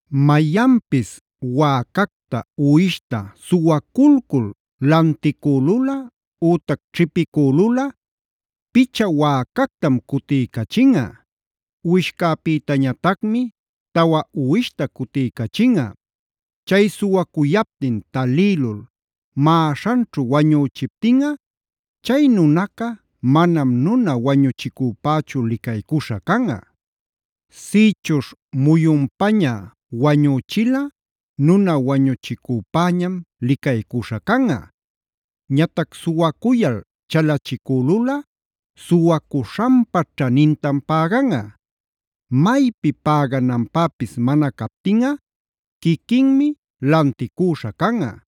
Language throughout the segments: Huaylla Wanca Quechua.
“Mayanpis wäcacta, uwishta suwaculcul lanticülulꞌa ütac ćhipicülulꞌa, picha wäcactam cutiycachinꞌa. Uwishcäpïtañatacmi tawa uwishta cutiycachinꞌa. “Chay suwacuyaptin talïlul maꞌaśhanćhu wañüchiptinꞌa, chay nunaca, manam nuna wañuchicüpächu licaycuśha canꞌa. Sïchuśh muyunpaña wañüchilꞌa nuna wañuchicüpäñam licaycuśha canꞌa. Ñatac suwacuyal chalachicülulꞌa suwacuśhanpa ćhanintam päganꞌa. Maypi pägananpäpis mana captinꞌa quiquinmi lanticüśha canꞌa.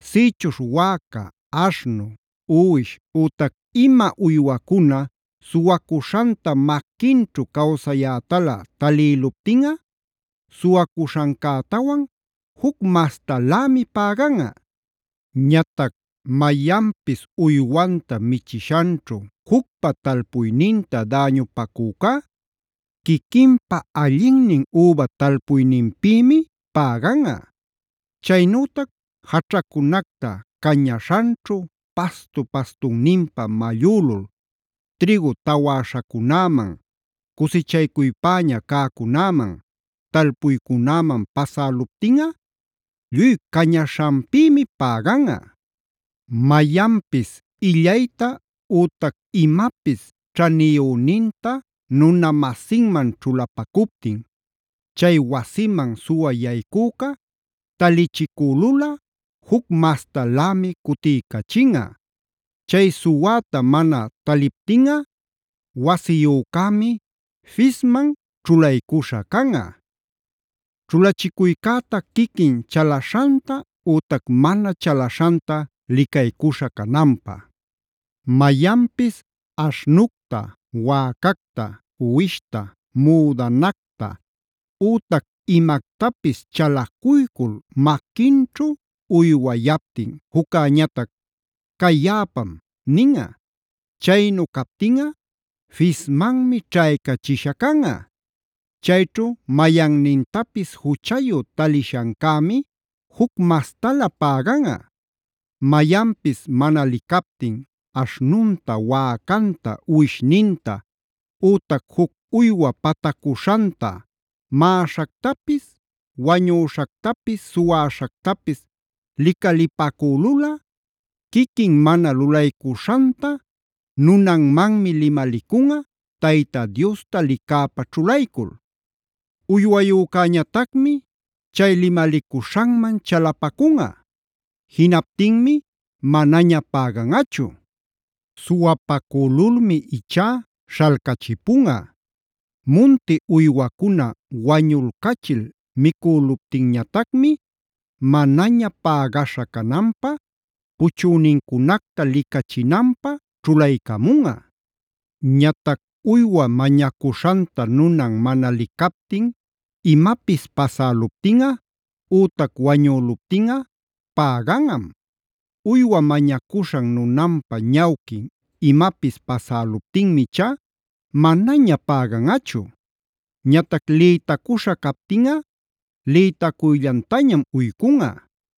“Sïchuśh wäca, aśhnu, uwish ütac ima uywacuna suwacuśhanta maquinćhu cawsayätalä talïluptinꞌa, suwacuśhancätawan juc mastalämi päganꞌa. “Ñatac mayanpis uywanta michiśhanćhu jucpa talpuyninta, däñupacücá quiquinpa allinnin üba talpuyninpïmi päganꞌa. “Chaynütac jaćhacunacta cañaśhanćhu pastu-pastunninpä mallülul trïgu tawäśhacunäman, cusichaycuypäña cäcunäman, talpuycunäman pasäluptinꞌa lluy cañaśhanpïmi päganꞌa. “Mayanpis illayta ütac imapis ćhaniyüninta nuna-masinman ćhulapacuptin, chay wasiman suwä yaycüca talichicülulꞌa juc mastalämi cutiycachinꞌa. Chay suwäta mana taliptinꞌa wasiyücämi fisman ćhulaycuśha canꞌa; ćhulachicuycäta quiquin chalaśhanta ütac mana chalaśhanta licaycuśha cananpä. “Mayanpis aśhnucta, wäcacta, uwishta, müdanacta, ütac imactapis chalacuycul maquinćhu uywayaptin, jucñatac: ‘Cay yaꞌapam’ ninꞌa. Chaynu captinꞌa fismanmi ćhaycachishä canꞌa. Chayćhu mayannintapis juchayu talishancämi juc mastalä päganꞌa. “Mayanpis mana licaptin aśhnunta, wäcanta, uwishninta, ütac juc uywa patacuśhanta, maꞌaśhactapis, wañüśhactapis, suwäśhactapis licalipacülulꞌa, quiquin mana lulaycuśhanta nunanmanmi limalicunꞌa Tayta Diosta licäpa ćhulaycul. Uywayücäñatacmi chay limalicuśhanman chalapacunꞌa. Jinaptinmi manaña päganꞌachu. Suwapacülulmi ichá śhalcachipunꞌa. Munti uywacuna wañulcachil micüluptinñatacmi manaña pägaśha cananpä puchünincunacta licachinanpä ćhulaycamunꞌa. “Ñatac uywa mañacuśhanta nunan mana licaptin imapis pasäluptinꞌa ütac wañüluptinꞌa päganꞌam. Uywa mañacuśhan nunanpa ñawquin imapis pasäluptinmi ichá manaña päganꞌachu. Ñatac lïtacuśha captinꞌa lïtacuyllantañam uycunꞌa.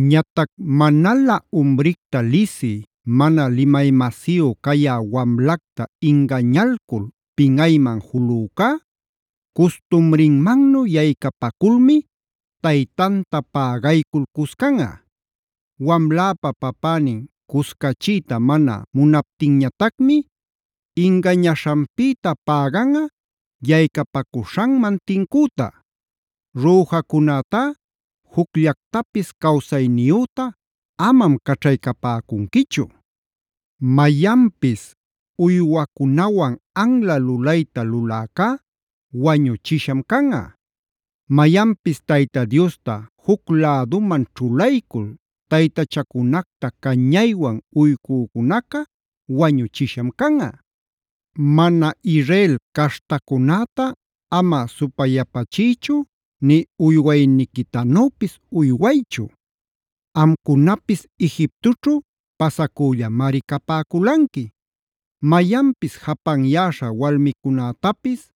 “Ñatac manalä umricta lisï, mana limay-masiyu cayä wamlacta ingañalcul pinꞌayman julücá, custumrinmannu yaycapaculmi taytanta pägaycul cuscanꞌa. Wamläpa papänin cuscachiyta mana munaptinñatacmi ingañaśhanpïta päganꞌa yaycapacuśhanman tincüta.a “Rüjacunätá jucllactapis cawsayniyüta amam caćhaycapäcunquichu.b “Mayanpis uywacunawan anla lulayta luläcá wañuchisham canꞌa.c “Mayanpis Tayta Diosta juc läduman ćhulaycul juc taytachacunacta cañaywan uycücunaca wañuchisham canꞌa.d “Mana Israel caśhtacunäta ama supayapachiychu nï uywayniquitanüpis uywaychu. Amcunapis Egiptoćhu pasacüllamari capäculanqui. “Mayanpis japanyäśha walmicunätapis,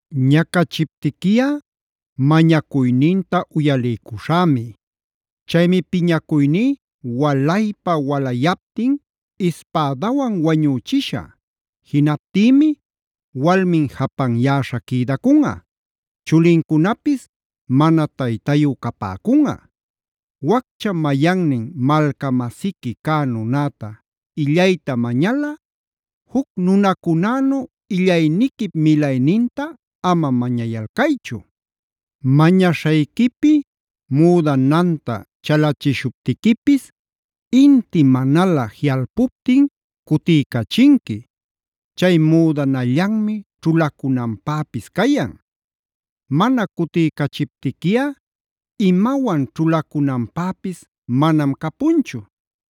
Ñacachiptiquiꞌa mañacuyninta uyaliycuśhämi. Chaymi piñacuyní walaypa-walayaptin ispädawan wañüchishä. Jinaptïmi walmin japanyäśha quïdacunꞌa; chulincunapis mana taytayu capäcunꞌa. “Waccha mayannin malca-masiqui cä nunäta illayta mañalꞌa juc nunacunänu illayniquip milayninta ama mañayalcaychu.f Mañaśhayquipi müdananta chalachishuptiquipis inti manalä jiꞌalpuptin cutiycachinqui. Chay müdanallanmi ćhulacunanpäpis cayan. Mana cutiycachiptiquiꞌa imawan ćhulacunanpäpis manam capunchu.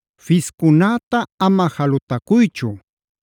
“Fiscunäta ama jalutacuychu.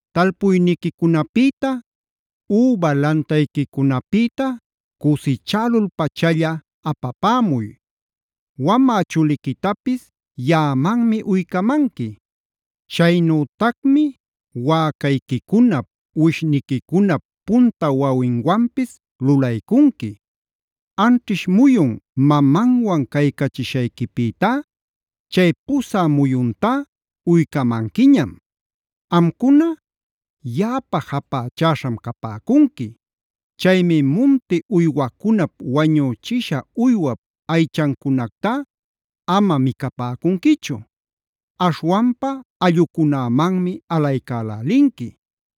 “Talpuyniquicunapïta, üba lantayquicunapïta cusichälul-pachalla apapämuy. “Wamä chuliquitapis yaꞌamanmi uycamanqui. Chaynütacmi wäcayquicunap, uwishniquicunap punta wawinwanpis lulaycunqui. Anćhish muyun mamanwan caycachishayquipïtá chay pusä muyuntá uycamanquiñam. “Amcuna, yaꞌapä japächäśham capäcunqui. Chaymi munti uywacunap wañüchisha uywap aychancunactá ama micapäcunquichu.i Aśhwanpa allꞌucunämanmi alaycälälinqui.